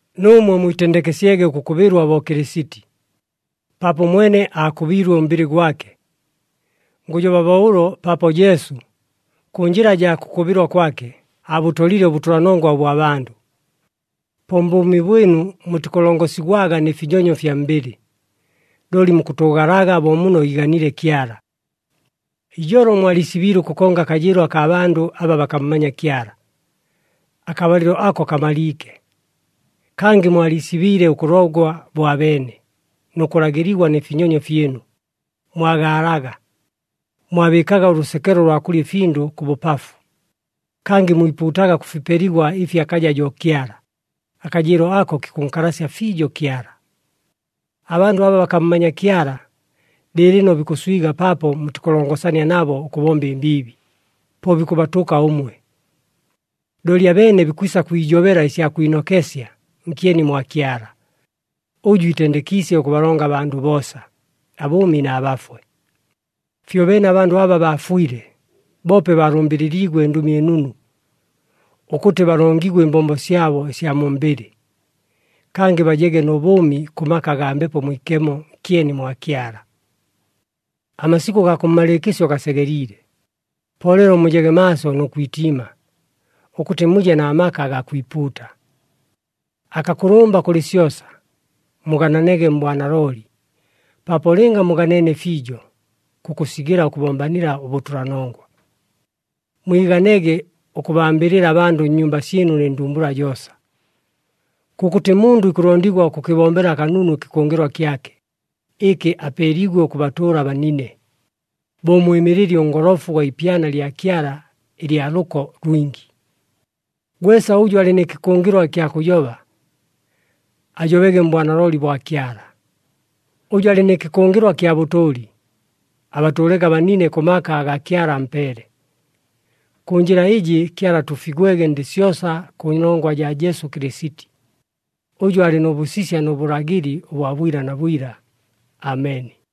Nuumwe mwitendekesyege ʉkʉkʉbɨlwa bo Kɨlɨsiti, paapo ʉmwene aakʉbiilwe ʉmbɨlɨ gwake. Ngʉjoba bo ʉlo paapo Jesu, kʉ njɨla jaa kʉkʉbɨlwa kwake, aabʉtolile ʉbʉtʉlanongwa ʉbwa bandʉ. Po mbʉʉmi bwɨnu mutikʉlongosigwaga nɨ finyonyo fya mbɨlɨ, looli mukʉtʉʉgalaga bo muno iiganiile Kyala. Ijolo mwaliisibiile ʉkʉkonga akajɨɨlo akaa bandʉ aba bakammanya Kyala. Akabalɨlo ako kamaliike. Kangɨ mwaliisibiile ʉkʉlogwa bo abeene nʉ kʉlagɨligwa nɨ finyonyo fyɨnu, mwagaalaga, mwabɨɨkaga ʉlʉsekelo lwa kʉlya ɨfindʉ kʉ bʉpafu. Kangɨ mwipuutaga kʉ fipeligwa ɨfi akaja jo Kyala, akajɨɨlo ako kikʉnkalasya fiijo Kyala. Abandʉ aba bakammanya Kyala, lɨɨlɨno bikʉswiga paapo mutikʉlongosania nabo ʉkʉbomba ɨmbiibi, po bikʉbatʉka ʉmwe. Looli abeene bikwisa kwijobela ɨsya kwinokesya nkyeni mwa Kyala, ʉjʉ iitendekiisye ʉkʉbalonga abandʉ boosa, abʉʉmi na bafwe. Fyobeene abandʉ aba baafwile, boope baalʉmbɨlɨliigwe ɨNdʉmi ɨNunu, ʉkʉtɨ balongigwe ɨmbombo syabo ɨsya mu mbɨlɨ, kangɨ bajege nʉ bʉʉmi kʉ maka agaa Mbepo Mwikemo nkyeni mwa Kyala. Amasikʉ gaa kʉmmalɨɨkɨsyo gasegeliile, po leelo mujege maaso nʉ kwitiima, ʉkʉtɨ muje na maka agaa kwipuuta. Akakʉlʉmba kʉlɨ syosa, mugananege mbwanalooli, paapo lɨnga muganeene fiijo, kukʉsigɨla ʉkʉbombanila ʉbʉtʉlanongwa. Mwiganege ʉkʉbambɨlɨla abandʉ nnyumba syɨnu nɨ ndumbula joosa. Kʉkʉtɨ mundʉ ikʉlondigwa ʉkʉkɨbombela kanunu ɨkɨkʉngɨlwa kyake, ɨkɨ apeeliigwe ʉkʉbatʉʉla abanine, bo ʉmwɨmɨlɨli ʉngolofu ʉgwa ipyana lya Kyala ɨlya lʉko lwingi. Gwesa ʉjʉ alɨ nɨ kɨkʉngɨlwa ɨkya kʉjoba, ajobege mbwanalooli bwa Kyala. Ʉjʉ alɨ nɨ kɨkʉngɨlwa kya bʉtʉʉli, abatʉʉlege abanine kʉ maka aga Kyala ampeele. Kʉ njɨla ɨjɨ, Kyala atuufigwege ndɨ syosa kʉnongwa jaa Jesu Kɨlɨsiti, ʉjʉ alɨ nʉ bʉsisya nʉ bʉlagɨli ʉbwa bwila na bwila. Ameni.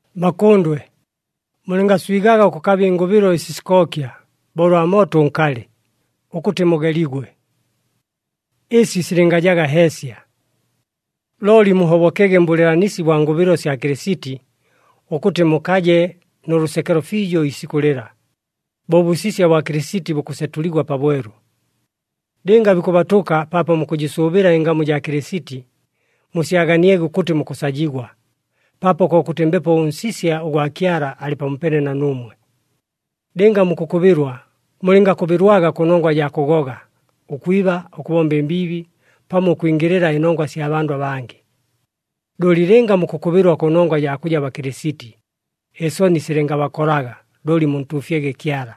Bakʉndwe, mulɨngaswigaga ʉkʉkaba ɨngʉbɨlo ɨsi sikookya bo ʉlwa mooto ʉnkalɨ, ʉkʉtɨ mugeligwe. Ɨsi silɨngajaga heesya. Looli muhobokege mbʉlɨɨlanisi bwa ngʉbɨlo sya Kɨlɨsiti, ʉkʉtɨ mukaje nʉ lʉsekelo fiijo iisikʉ lɨla, bo ʉbʉsisya bwa Kɨlɨsiti bukʉsetʉligwa pabwelu. Lɨnga bikʉbatʉka paapo mukʉjɨsʉʉbɨla ɨngamu jaa Kɨlɨsiti, musyaganiege ʉkʉtɨ mukʉsajigwa, paapo kokʉtɨ Mbepo ʉNsisya ʉgwa Kyala alɨ pamopeene na nuumwe. Lɨnga mukʉkʉbɨlwa, mulɨngakʉbɨlwaga kʉnongwa jaa kʉgoga, ʉkwiba, ʉkʉbomba ɨmbiibi, pamo ʉkwingɨlɨla ɨnongwa ɨsya bandʉ abangɨ. Looli lɨnga mukʉkʉbɨlwa kʉnongwa jaa kʉja Bakɨlɨsiti, ɨsoni silɨngabakolaga looli muntuufyege Kyala,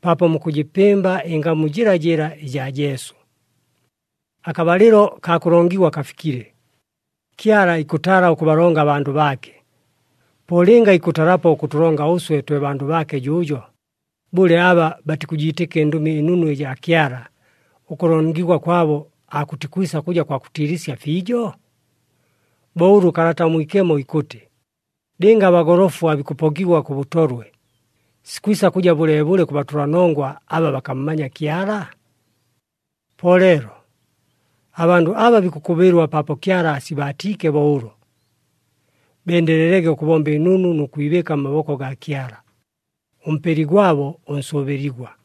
paapo mukʉjɨpɨmba ɨngamu jɨlajɨla ɨjaa Jesu. Akabalɨlo kaa kʉlongigwa kafikile, Kyala ikʉtala ʉkʉbalonga abandʉ baake. Po lɨnga ikʉtalapo ʉkʉtʉlonga ʉswe twe bandʉ baake jʉʉjo, bʉle, aba batikʉjiitɨka ɨNdʉmi ɨNunu ɨjaa Kyala, ʉkʉlongigwa kwabo aakʉtikwisa kʉja kwa kʉtiilɨsya fiijo? Bo ʉlʉ Kalata ʉMwikemo ikʉtɨ, “Lɨnga abagolofu aabikʉpokigwa kʉ bʉtolwe, sikwisa kʉja bʉleebʉle kʉ batʉlanongwa aba bakammanya Kyala?” Po leelo, abandʉ aba bikʉkʉbɨlwa paapo Kyala aasibaatiike bo ʉlo, bendelelege ʉkʉbomba ɨnunu nʉ kwibɨɨka mmaboko gaa Kyala, ʉMpeli gwabo ʉnsʉʉbɨligwa.